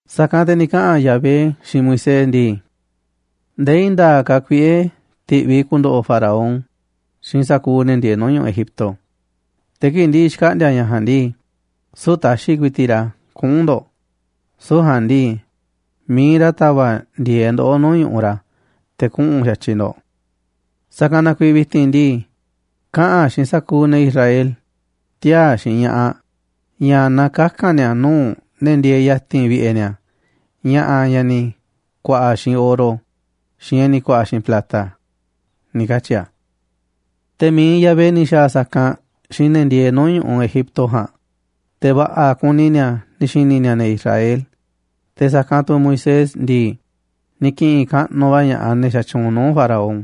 Sa̱kanꞌ te̱ ni̱ kaꞌa̱n Yahvé xiinꞌ Moisés ndii: ―Ndee i̱i̱n nda̱a̱ꞌ ka̱ kuiꞌe̱ ti̱ꞌviꞌ i̱ ku̱ndo̱ꞌo̱ Faraón xiinꞌ sa̱kuuꞌ ne̱ ndieeꞌ nuu̱ꞌ ñu̱ꞌuꞌ Egipto, te̱ kii̱ꞌ ndi̱ꞌi̱ xkaꞌndi̱a̱ ña̱ ja̱a̱nꞌ ndii, süu̱ꞌ ta̱xi̱ ku̱i̱ti̱ꞌ ra̱ kuꞌu̱n ndo̱ꞌ, süu̱ꞌ ja̱a̱nꞌ ndii, mi̱iꞌ ra̱ ta̱va̱ꞌ ndi̱e̱eꞌ ndoꞌó nuu̱ꞌ ñu̱ꞌuꞌ ra̱ te̱ kuꞌu̱n xa̱tyiꞌ ndo̱ꞌ. Sa̱kanꞌ na kuiiꞌ vi̱ti̱n ndii, kaꞌa̱n xiinꞌ sa̱kuuꞌ ne̱ Israel, tiaa̱ xiinꞌ ña̱ꞌaꞌ, ña̱ na kaka̱n ni̱a̱ nuu̱ꞌ ne̱ ndieeꞌ ya̱ti̱n vi̱ꞌe̱ ni̱a̱ ña̱ꞌa̱ ña̱ ni̱ ku̱a̱ꞌa̱ xiinꞌ oro, xiinꞌ ña̱ ni̱ ku̱a̱ꞌa̱ xiinꞌ plata ―ni̱ katyi̱ a̱. Te̱ mi̱iꞌ Yahvé ni̱ xa̱a̱ sa̱kanꞌ xiinꞌ ne̱ ndieeꞌ nuu̱ꞌ ñu̱ꞌuꞌ Egipto ja̱a̱nꞌ, te̱ va̱ꞌa̱ kuni ni̱a̱ ni̱ xi̱ni̱ ni̱a̱ ne̱ Israel, te̱ sa̱kanꞌ tu̱ Moisés ndii, ni̱ ki̱ꞌi̱n kaꞌnuꞌ va̱ ña̱ꞌaꞌ ne̱ xatyuunꞌ nuu̱ꞌ Faraón,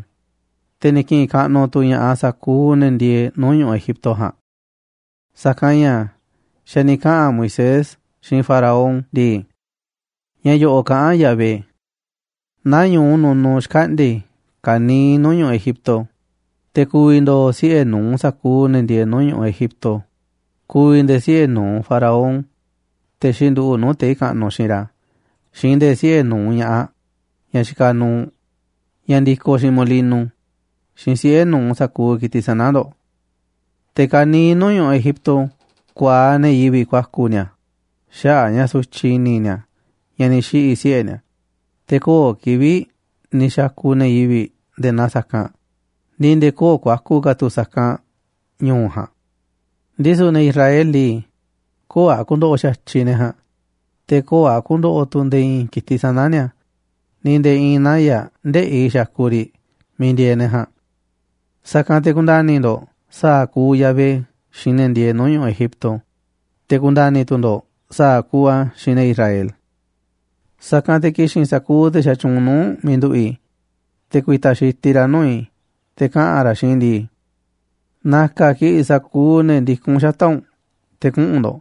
te̱ ni̱ ki̱ꞌi̱n kaꞌnuꞌ tu̱ ña̱ꞌaꞌ sa̱kuuꞌ ne̱ ndieeꞌ nuu̱ꞌ ñu̱ꞌuꞌ Egipto ja̱a̱nꞌ. Sa̱kanꞌ ña̱ xa̱ ni̱ kaꞌa̱n Moisés xiinꞌ Faraón ndii: ―Ña̱ yo̱ꞌo̱ꞌ kaꞌán Yahvé: “Nañu̱u nunuꞌ xkaꞌndi̱a̱ i̱ ka̱niiꞌ nuu̱ꞌ ñu̱ꞌuꞌ Egipto, te̱ ku̱vi̱ ndo̱o̱ siꞌe̱ nu̱uꞌ sa̱kuuꞌ ne̱ ndieeꞌ nuu̱ꞌ ñu̱ꞌuꞌ Egipto, ku̱vi̱ nde̱e̱ siꞌe̱ nu̱uꞌ Faraón, te̱ xinduꞌu̱ꞌ nuu̱ꞌ tei̱ kaꞌnuꞌ xiinꞌ ra̱, xiinꞌ nde̱e̱ siꞌe̱ nu̱uꞌ ña̱ꞌaꞌ ñaꞌ xikaꞌ nuuꞌ, ñaꞌ ndikoꞌ xiinꞌ molino, xiinꞌ siꞌe̱ nu̱uꞌ sa̱kuuꞌ ki̱tiꞌ sana̱ ndo̱ꞌ. Te̱ ka̱niiꞌ nuu̱ꞌ ñu̱ꞌuꞌ Egipto ku̱a̱aꞌ ne̱ yivi̱ꞌ ku̱a̱ku̱ ni̱a̱ xaꞌa̱ꞌ a̱ ña̱ sutyiꞌ i̱ni̱ ni̱a̱ ña̱ ni̱ xiꞌi̱ siꞌe̱ ni̱a̱, te̱ köo̱ꞌ kivi̱ꞌ ni̱ xa̱ku̱ ne̱ yivi̱ꞌ nde̱e̱ naa sa̱kanꞌ, ni̱ nde̱e̱ köo̱ꞌ ku̱a̱ku̱ ka̱ tu̱ sa̱kanꞌ ñu̱u̱ ja̱a̱nꞌ. Ndisu̱ ne̱ Israel ndii, te̱ köo̱ꞌ a̱ ku̱ndo̱ꞌo̱ xa̱tyiꞌ ne̱ ja̱a̱nꞌ, te̱ köo̱ꞌ a̱ ku̱ndo̱ꞌo̱ tu̱ nde̱e̱ i̱i̱n ki̱tiꞌ sana̱ ni̱a̱, ni̱ nde̱e̱ i̱i̱n naya̱ꞌ ndëꞌi̱ xakuꞌ riꞌ miiꞌ ndieeꞌ ne̱ ja̱a̱nꞌ. Sa̱kanꞌ te̱ ku̱nda̱ni̱ ndo̱ꞌ sa̱a̱ kuuꞌ Yahvé xiinꞌ ne̱ ndieeꞌ nuu̱ꞌ ñu̱ꞌuꞌ Egipto, te̱ ku̱nda̱ni̱ tu̱ ndo̱ꞌ sa̱a̱ kuuꞌ a̱ xiinꞌ ne̱ Israel. Sa̱kanꞌ te̱ ki̱xi̱n sa̱kuuꞌ te̱ xatyuunꞌ nuu̱ꞌ u̱nꞌ miiꞌ nduꞌu̱ꞌ i̱, te̱ ku̱i̱ta̱ xitiꞌ ra̱ nuu̱ꞌ i̱ te̱ kaꞌa̱n ra̱ xiinꞌ i̱ ndii: ‘Na̱ka̱ kiꞌi̱ꞌ sa̱kuuꞌ ne̱ ndikún xata̱ꞌ u̱nꞌ te̱ kuꞌu̱n ndo̱ꞌ’,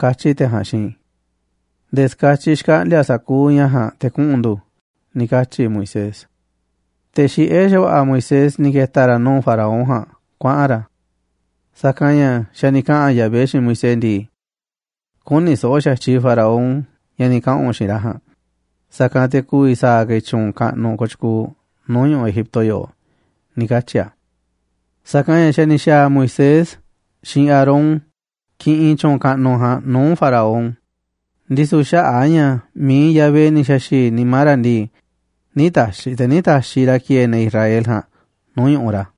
katyi̱ te̱ ja̱a̱nꞌ xiinꞌ i̱. Nde̱e̱ ska̱tyiꞌ xkaꞌndi̱a̱ sa̱kuuꞌ ña̱ ja̱a̱nꞌ te̱ kuꞌu̱n ndu̱” ―ni̱ katyi̱ Moisés. Te̱ xiꞌé xa̱va̱ꞌa̱ Moisés ni̱ ke̱ta̱ ra̱ nuu̱ꞌ Faraón ja̱a̱nꞌ kuaꞌa̱n ra̱. Sa̱kanꞌ ña̱ xa̱ ni̱ kaꞌa̱n Yahvé xiinꞌ Moisés ndii: ―Kü̱ni̱ so̱ꞌo̱ xa̱tyiꞌ Faraón ña̱ ni̱ kaꞌa̱n u̱nꞌ xiinꞌ ra̱ ja̱a̱nꞌ, sa̱kanꞌ te̱ ku̱vi̱ sa̱a̱ ka̱ i̱ tyu̱u̱n kaꞌnuꞌ kooꞌ tyukuuꞌ nuu̱ꞌ ñu̱ꞌuꞌ Egipto yoꞌoꞌ ―ni̱ katyi̱ a̱. Sa̱kanꞌ ña̱ xa̱ ni̱ xa̱a̱ Moisés xiinꞌ Aarón kiꞌinꞌ tyu̱u̱n kaꞌnuꞌ ja̱a̱nꞌ nuu̱ꞌ Faraón, ndisu̱ xaꞌa̱ꞌ a̱ ña̱ mi̱iꞌ Yahvé ni̱ xa̱xi̱i̱ nimá ra̱ ndii, ̱ nï̱ ta̱xi̱ te̱ nï̱ taxiꞌ ra̱ ki̱e̱e̱ ne̱ Israel ja̱a̱nꞌ nuu̱ꞌ ñu̱ꞌuꞌ ra̱.